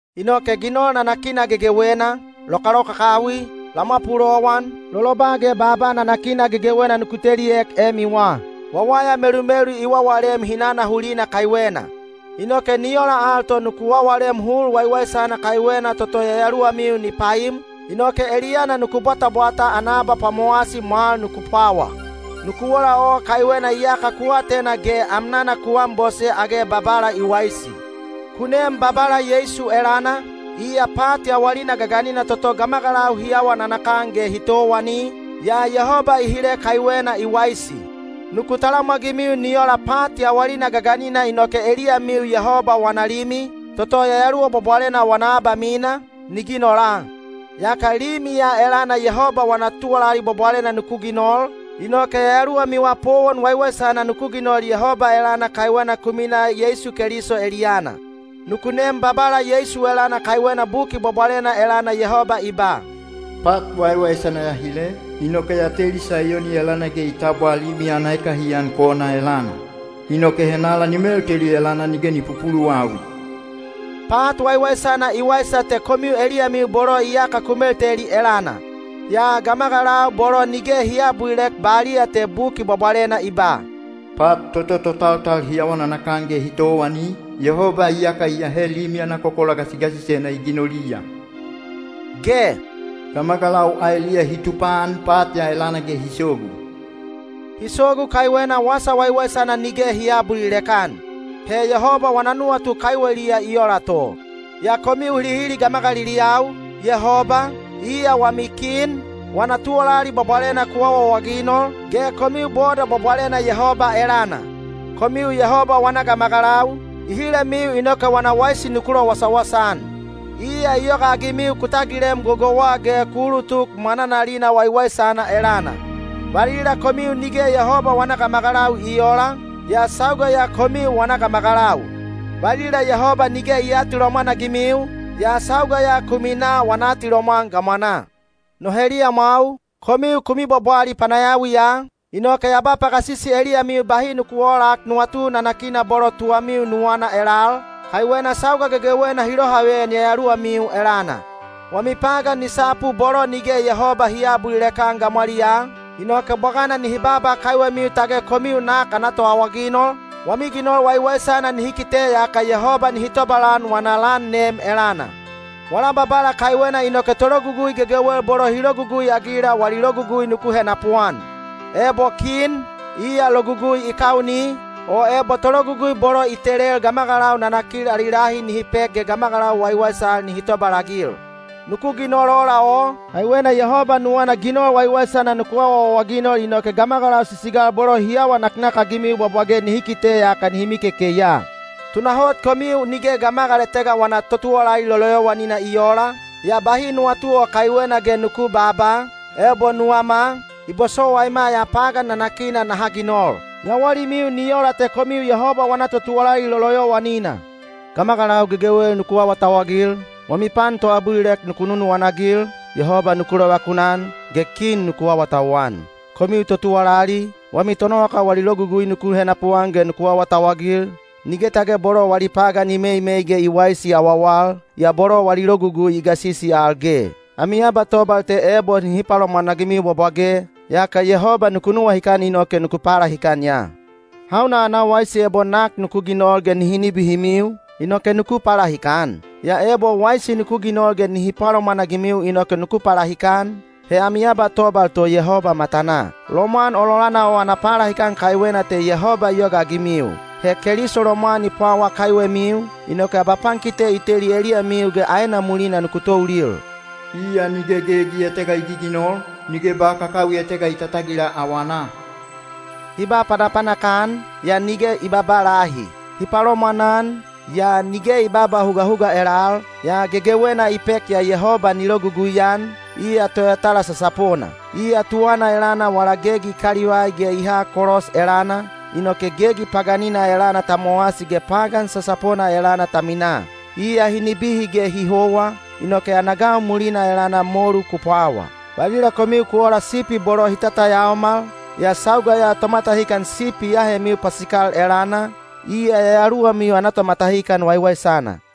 Inoke ginol nanakina gegewena, lokalokakawi, lamwa pulowan, loloba ge baaba nanakina gegewena nuku teliek emiwa. Wawaya melumelu i wawalem hinana hulina kaiwena. Inoke ni ola al to nuku wawalem hul waiwaisana kaiwena toto yayaluwamiu ni paim, inoke eliyana nuku bwatabwata ana abapwamowasi mwal nuku pwawa. Nuku ola o kaiwena iyaka ku atena ge amnana ku anbose age Babala i waisi. Ku nem Babala Yeisu elana, iya pat yawalina gaganina toto gamagalau hi awa nanakan ge hi towani, yaa Yehoba i hile kaiwena i waisi. Nuku talamwagimiu nuku ola pat yawalina gaganina inoke eliyamiu Yehoba wana Limi, toto Yayaluwa Bwabwalena wana abamina, ni ginola. Yaka Limi ya elana Yehoba wana tuwalali bwabwalena nuku ginol, inoke yayaluwamiwa powon waiwaisana nuku ginol Yehoba elana kaiwena ku minaa Yeisu Keliso eliyana. Nuku nem Babala Yeisu elana kaiwena Buki Bwabwalena elana Yehoba i ba, “Pat waiwaisana ya hile, inoke ya teli Saiyoni elana ge i tabwa limi ana ekahiyan kona elana. Inoke henala ni melteli elana nige ni pupuluwawi.” Pat waiwaisana i waisa te komiu eliyamiu bolo iyaka ku melteli elana. Yaa gamagalau bolo nige hi aabulilek baliya te Buki Bwabwalena i ba, “Pat toto totaltal hi awa nanakan ge hi towani, Yehoba iyaka i ahe limi ana kokola gasigasisena i ginoliya” ge “gamagalau aeliya hi tupaan pat ya elana ge hi sogu.” Hi sogu kaiwena Wasa Waiwaisana nige hi aabulilek-an. He Yehoba wana nuwatu kaiweliya i ola to. Yaa komiu hilihili gamagaliliyau, Yehoba, iya wami kin, wana tuwalali bwabwalena ku awaawaginol, ge komiu boda bwabwalena Yehoba elana. Komiu Yehoba wana gamagalau, i hilemiu inoke wana waisi nuku lowasawasa-an. Iya i yogaagimiu ku tagilem gogouwa ge ku ulutuk mwananalina waiwaisana elana. Valila komiu nige Yehoba wana gamagalau i oola, yaa sauga ya komiu wana gamagalau; valila Yehoba nige i aatilomwan-agimiu, yaa sauga ya ku minaa wana atilomwan gamwanaa. No heliyamwau, komiu ku mibwabwali panayawiya, inoke ya ba pagasisi eliyamiu bahi nuku oolak nuwatu nanakina bolo tuwamiu nuwana elal, kaiwena sauga gegewena hi lohaveyan yayaluwamiu elana. Wami pagan ni sapu bolo nige Yehoba hi aabulilek-an gamwaliyaa, inoke bwagana nihi baaba kaiwemiu tage komiu nak ana toawaginol, wami ginol waiwaisana nihi kite yaka Yehoba nihi tobalan wana lan nem elana. Wala Babala kaiwena inoke tologugui gegewel bolo hi logugui-agila wali logugui nuku henapuan: ebo kin, iya logugui i kauni, o ebo tologugui bolo i telel gamagalau nanakil ali lahi nihi pek ge gamagalau waiwaisal nihi tobalagil. Nuku ginol ola o, kaiwena Yehoba nuwana ginol waiwaisana nuku awaawaginol inoke gamagalau sisigal bolo hi awa naknakagimiu bwabwage nihi kite yaka nihi mikekei ya. Tunahot komiu nige gamagal etega wana totuwalali loloyowanina i oola, yaa bahi nuwatu o kaiwena ge nuku babaa, “Ebo nuwama, i bosowaima ya pagan nanakina naha ginol.” Yawalimiu ni ola te komiu Yehoba wana totuwalali loloyowanina. Gamagalau gegewel nuku awatauwagil, wami pan toabulilek nuku nunuwana-agil, Yehoba nuku lovakunan, ge kin nuku awatauwan. Komiu totuwalali, wami tonowakau wali logugui nuku henapuan ge nuku awatauwagil, nige tage bolo wali pagan i meimei ge i waisi awawal, yaa bolo wali logugui i gasisi al ge. Ami abatobal te ebo hi palomwanagimiu bwabwage, yaka Yehoba ku nuwahikan inoke ku palahikan ya. Hauna ana waisi ebo nak nuku ginol ge nihi nibihimiu, inoke nuku palahikan? Yaa ebo waisi nuku ginol ge nihi palomwanagimiu inoke nuku palahikan, he ami abatobal to Yehoba matanaa. Lomwan ololana o ana palahikan kaiwena te Yehoba i yogaagimiu. He Keliso lomwan i pwawa kaiwemiu, inoke abapankite i teli eliyamiu ge aena mulina nuku toulil. Iya nige gegi etega i giginol, nige ba kakawi etega i tatagila awanaa. Hi ba panapanak-an, yaa nige i babaa lahi. Hi palomwanan, yaa nige i babaa hugahuga elal, yaa gegewena i pek ya Yehoba ni logugui-an, iya Toyatala sasapona. Iya tuwana elana wala gegi i kalivai ge i ha kolos elana, inoke gegi paganina elana ta mowasi ge pagan sasapona elana ta minaa. Iya hi nibihi ge hi howa, inoke ana gau mulina elana molu ku pwawa. Valila komiu ku ola sipi bolo hi tatayaomal, yaa sauga ya Tomatahikan Sipi i ahemiu pasikal elana, iya yayaluwamiu ana tomatahikan waiwaisana.